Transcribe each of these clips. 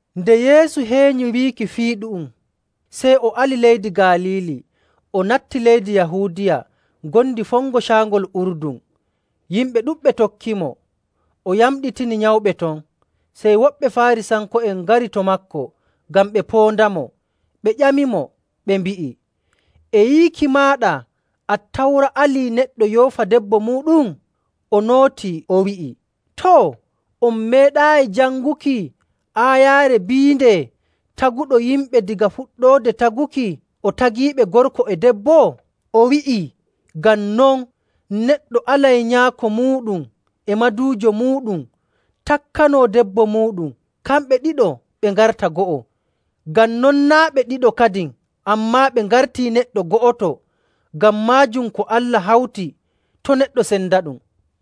Nde Yeesu heenyi wiiki fii ɗu'um, sey o ali leydi Galiili o natti leydi Yahuudiya ngondi fongo Caangol Urdun. Yimɓe ɗuɗɓe tokkimo, o yamɗitini nyawɓe ton. Sey woɓɓe Faarisanko'en ngari to maako ngam ɓe poondamo, ɓe ƴamimo, ɓe mbi'i, “E yiiki maaɗa Attawra alii neɗɗo yoofa: Waato seera koo sendira e debbo muuɗum. debbo muuɗum?” O nootii, o wi'i, “Too, on meeɗaayi janguki aayaare biinde taguɗo yimɓe daga fuɗɗoode taguki o tagiiɓe gorko e debbo?. O wi'ii, ‘Ngam non neɗɗo alay nyaako muuɗum e maduujo muuɗum takkanoo debbo muuɗum, kamɓe ɗiɗo ɓe ngarta go'o.’. Ngam non naa' ɓe ɗiɗo kadin, ammaa ɓe ngartii neɗɗo go'oto. Ngam maajum ko Allah hawti, to' neɗɗo sendaɗum.”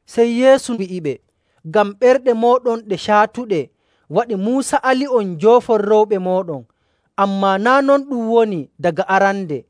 Sey Yeesu wi'iɓe, “Ngam ɓerɗe mooɗon ɗe caatuɗe waɗi Muusa ali'on njoofon rewɓe mooɗon, ammaa naa' non ɗum woni daga arande.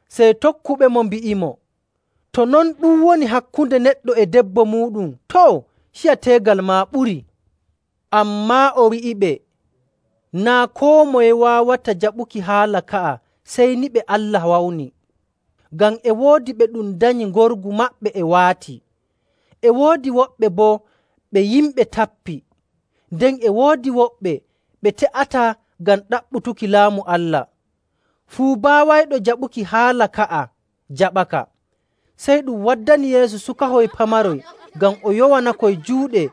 Sey tokkuɓemo mbi'imo, “To non ɗum woni hakkunde neɗɗo e debbo muuɗum, too, ciya teegal maa ɓurii.” Ammaa o wi'iɓe, “Naa' koo moye waawata jaɓuki haala ka'a, sey ni ɓe Allah wawni. Ngam e woodi ɓe ɗum danyi ngorgu maɓɓe e waati. E woodi woɓɓe boo ɓe yimɓe tappi. Nden e woodi woɓɓe ɓe te'ataa ngam ɗaɓɓutuki Laamu Allah. Fuu baawayɗo jaɓuki haala ka'a jaɓaka.” Sey ɗum waddani Yeesu sukahoy pamaroy ngam o yowanakoy juuɗe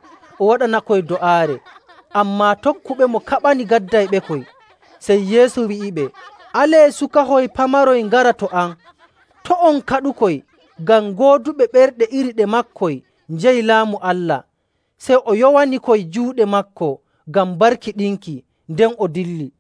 o waɗanakoy do'aare. Ammaa tokkuɓemo kaɓani gaddayɓekoy. Sey Yeesu wi'iɓe, “Alee sukahoy pamaroy ngara to am. To' on kaɗukoy, ngam gooduɓe ɓerɗe iri ɗe maakoy njeyi Laamu Allah.” Sey o yowanikoy juuɗe maako ngam barkiɗinki, nden o dilli.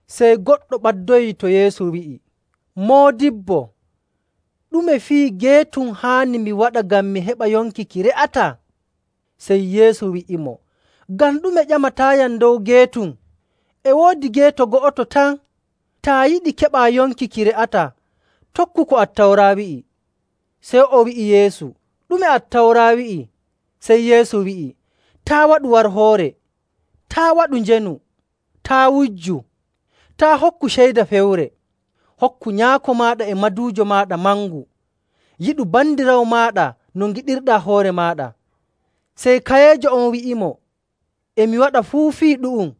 Sey goɗɗo ɓaddoyii to Yeesu wi'i, “Moodibbo, ɗume fii geetum haani mi waɗa ngam mi heɓa yonki ki re'ataa?” Sey Yeesu wi'imo, “Ngam ɗume ƴamataayam dow geetum? E woodi geeto go'oto tan. Taa yiɗi keɓaa yonki ki re'ataa, tokku ko Attawra wi'i.” Sey o wi'i Yeesu, “Ɗume Attawra wi'i?”. Sey Yeesu wi'i, “Taa' waɗu warhoore. Taa' waɗu njeenu. Taa' wujju. Taa' hokku ceyda fewre. Hokku nyaako maaɗa e maduujo maaɗa mangu. Yiɗu bandiraawo maaɗa no ngiɗirɗaa hoore maaɗa.”. Sey kayeejo on wi'imo, “E mi waɗa fuu fii ɗu'um.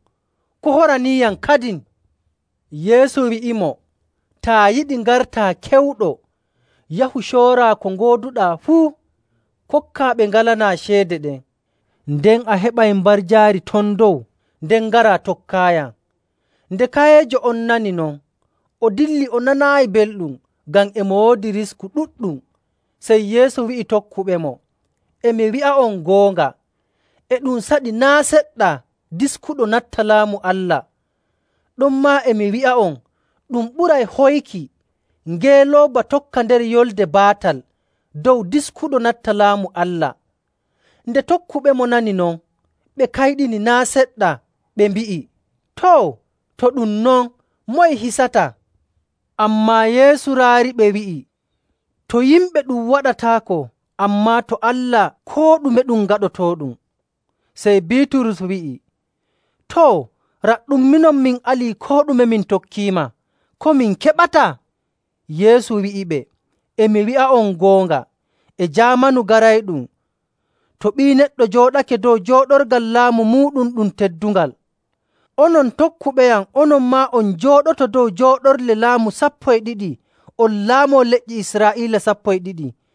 Ko horaniiyam kadin?” Yeesu wi'imo, “Taa yiɗi ngartaa kewɗo, yahu, cooraa ko ngooduɗaa fuu, kokkaa ɓe ngalanaa ceede ɗen, nden a heɓay mbarjaari ton dow. Nden ngaraa, tokkaayam.” Nde kayeejo on nani non, o dilli o nanaayi belɗum, ngam e mo woodi risku ɗuɗɗum. Sey Yeesu wi'i tokkuɓemo, “E mi wi'a'on goonga, e ɗum saɗi naa' seɗɗa diskuɗo natta Laamu Allah. Ɗonmaa e mi wi'a'on, ɗum ɓuray hoyki ngeelooba tokka nder yolnde baatal dow diskuɗo natta Laamu Allah.” Nde tokkuɓemo nani non, ɓe kayɗini naa' seɗɗa, ɓe mbi'i, “Too, to ɗum non, moye hisata?” Ammaa Yeesu raariɓe, wi'i, “To yimɓe ɗum waɗataako, ammaa to Allah koo ɗume ɗum gaɗotooɗum.” Sey Biiturus wi'i, “Too, raɗɗum, minon min alii koo ɗume min tokkiima. Ko min keɓata?” Yeesu wi'iɓe, “E mi wi'a'on goonga, e jaamanu garayɗum, to Ɓii Neɗɗo jooɗake dow jooɗorgal laamu muuɗum ɗum teddungal, onon tokkuɓeyam onon maa on njooɗoto dow jooɗorle laamu sappo e ɗiɗi, on laamoo lenyi Israa'iila sappo e ɗiɗi..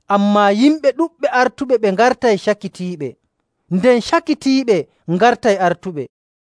Ammaa yimɓe ɗuɗɓe artuɓe ɓe ngartay cakitiiɓe, nden cakitiiɓe ngartay artuɓe..